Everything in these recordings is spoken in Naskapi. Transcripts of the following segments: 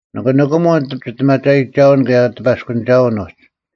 ᓂᑭ ᓂᑭᒧᓐ ᒋᔅᑎᒪᒐᔨᒋᒐᐅᓐ ᑭᔭ ᑎᐸᔅᑯᓂᒐᐅᓐ ᐅᒡ: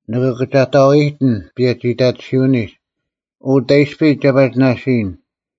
ᓂᑭ ᑭᒐᑕᐤ ᐃᔨᑎᓐ ᐸᔭᒋᐃᑕᑎᓯᐅᓂᒡ᙮ ᐅ, ᑕᐃᔅᐱ ᒐ ᐸᒋ ᓇᓯᔨᓐ?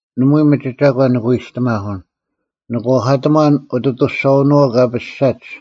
ᓇᒪᐎᔾ ᒥᒋ ᒐᒂᓐ ᓂᑭ ᐎᔨᔅᑎᒪᓱᓐ; ᓂ ᐛᐧᑲᑕᒺᓐ ᐅᑦ ᐊᑐᔅᒐᐅᓄᐛᐤ ᑲ ᐱᔅᒐᒡ;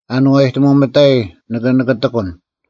ᐊᓏᔨᑎᒧᐤ ᒥᑕᐃ ᓂᑭ ᓂᑭᑎᑯᓐ: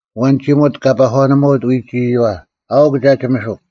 ᐊᐛᓐ ᒋᒧᑦ ᑲ ᐸᒂᓄᒪᑦ ᐎᒡ ᐃᔪᐛ, ᐊᐅᒄ ᒐ ᒋᒥᓱᒄ: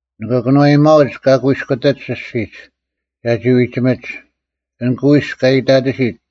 ᓂᑭ ᑭᓄᐛᐱᒪᐅᒡ ᑲ ᑯᐃᔅᑯᑎᒡ ᐊᔅᒋᒡ, ᒐᒋ ᐎᒋᒥᒡ: ᐊᓐ ᑯᐃᔅᒄ ᑲ ᐃᑕᑎᓯᑦ,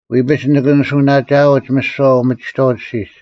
ᐎᐱᒡ ᓂᑭ ᓂᓱᐅᓇᒋᐊᐅᒡ ᒥᓯᐛ ᐅᒥᒋᑥᐅᒡ ᐊᔅᒋᒡ;